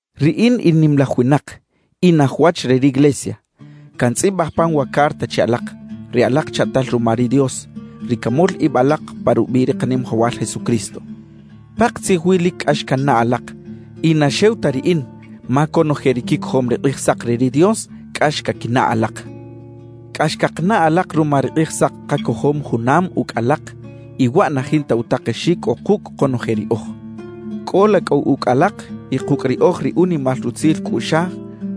Riꞌin in nimalaj winak, in aj wach re riglesia; cantzꞌibaj pan wa carta che alak, ri alak chaꞌtal ruma ri Dios, ri camol ib alak pa rubiꞌ ri Kanimajawal Jesucristo. Pakatzij wi lic cꞌax cannaꞌ alak, y na xew ta riꞌin ma conoje ri quicojom ri Kꞌijsak re ri Dios cꞌax caquinaꞌ alak. Cꞌax cakanaꞌ alak ruma ri Kꞌijsak kacojom junam ucꞌ alak y waꞌ na jinta utakexic cꞌo kucꞌ konoje riꞌoj. Cꞌola cꞌu ucꞌ alak y kucꞌ riꞌoj ri unimal rutzil cꞌuꞌxaj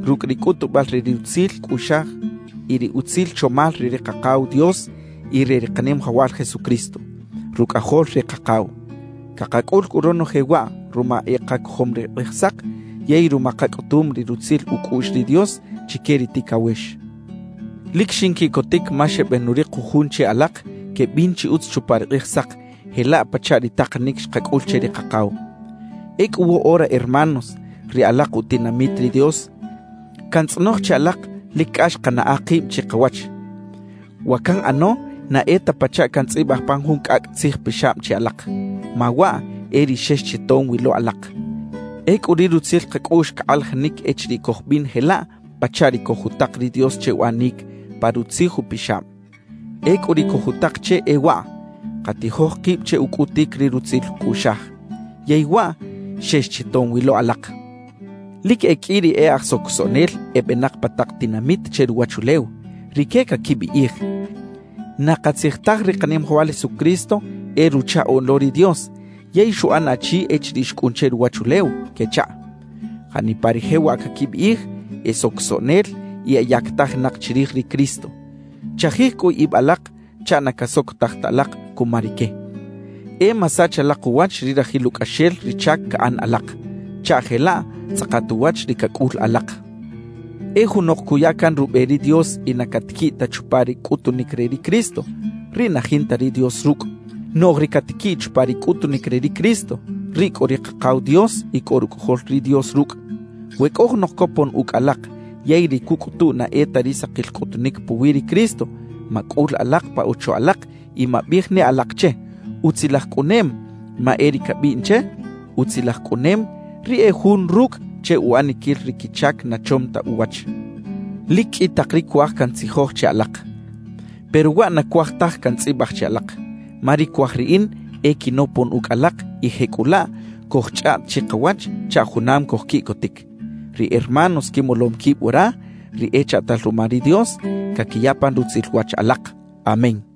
rucꞌ ri cꞌutubal re ri rutzil cꞌuꞌxaj y ri utzil chomal re ri Kakaw Dios y re ri Kanimajawal Jesucristo, Rucꞌajol ri Kakaw. Cakacꞌul cꞌu ronoje waꞌ ruma e kacojom ri Kꞌijsak yey ruma kacꞌutum ri rutzil ucꞌuꞌx ri Dios chique ri ticawex. Lic xinquiꞌcotic ma xebenurik jujun che alak quebin chi utz chupa ri Kꞌijsak jelaꞌ pachaꞌ ri takanic xkacꞌul che ri Kakaw. Ecꞌu woꞌora hermanos ri alak utinamit ri Dios, cantzꞌonoj che alak lic cꞌax kanaꞌa kib chikawach. Wa canꞌano na e ta pachaꞌ cantzꞌibaj pan jun cꞌacꞌ tzijpixab che alak, ma waꞌ e ri xex chi tom wi lo alak. Ecꞌu ri rutzil kacꞌuꞌx cakꞌalajinic echiriꞌ cojbin jelaꞌ pachaꞌ ri cojutak ri Dios che uꞌanic pa Rutzij Upixab. Ecꞌu ri cojutak che e waꞌ: Katijoj kib che ucꞌutic ri rutzil cꞌuꞌxaj. Yey waꞌ xex chi tom wi lo alak. Lic e qꞌui ri e aj socosoꞌnel ebenak pa tak tinamit che ruwachulew, rique caquibiꞌij: «Na katzij taj ri Kanimajawal Jesucristo e Ruchaꞌoꞌn lo ri Dios yey xuꞌan achi echiriꞌ xcꞌun che ruwachulew» quechaꞌ. Janipa ri jewaꞌ caquibiꞌij, e socosoꞌnel y eyactajinak chirij ri Cristo. Chajij cꞌu ib alak chaꞌ na casocotaj ta alak cuma rique; e masach alak uwach ri rajil ucꞌaxel ri chac caꞌan alak, chaꞌ jelaꞌ tzꞌakat uwach ri cacꞌul alak. E junok cuya can rube ri Dios y na catiquiꞌ ta chupa ri cꞌutunic re ri Cristo, riꞌ na jinta ri Dios rucꞌ. Noꞌj ri catiquiꞌ chupa ri cꞌutunic re ri Cristo, riꞌ cꞌo ri Kakaw Dios y cꞌo Rucꞌajol ri Dios rucꞌ. We cꞌo junok copon ucꞌ alak yey ri cucꞌutu na e ta ri sakil cꞌutunic puwi ri Cristo, macꞌul alak pa ocho alak y mabiꞌij ne alak che: «¡Utzilaj cꞌunem!» Ma e ri cabiꞌn che: «¡Utzilaj cꞌunem!» riꞌ e jun rucꞌ che uꞌaniquil ri quichac na chom ta uwach. Lic qꞌui tak ri cuaj cantzijoj che alak, pero waꞌ na cuaj taj cantzꞌibaj che alak, ma ri cuaj riꞌin e quinopon ucꞌ alak y jecꞌulaꞌ cojchꞌaꞌt chikawach chaꞌ junam cojquiꞌcotic. Ri hermanos quimolom quib wara, ri echaꞌtal ruma ri Dios, caquiya pan rutzil wach alak. Amén.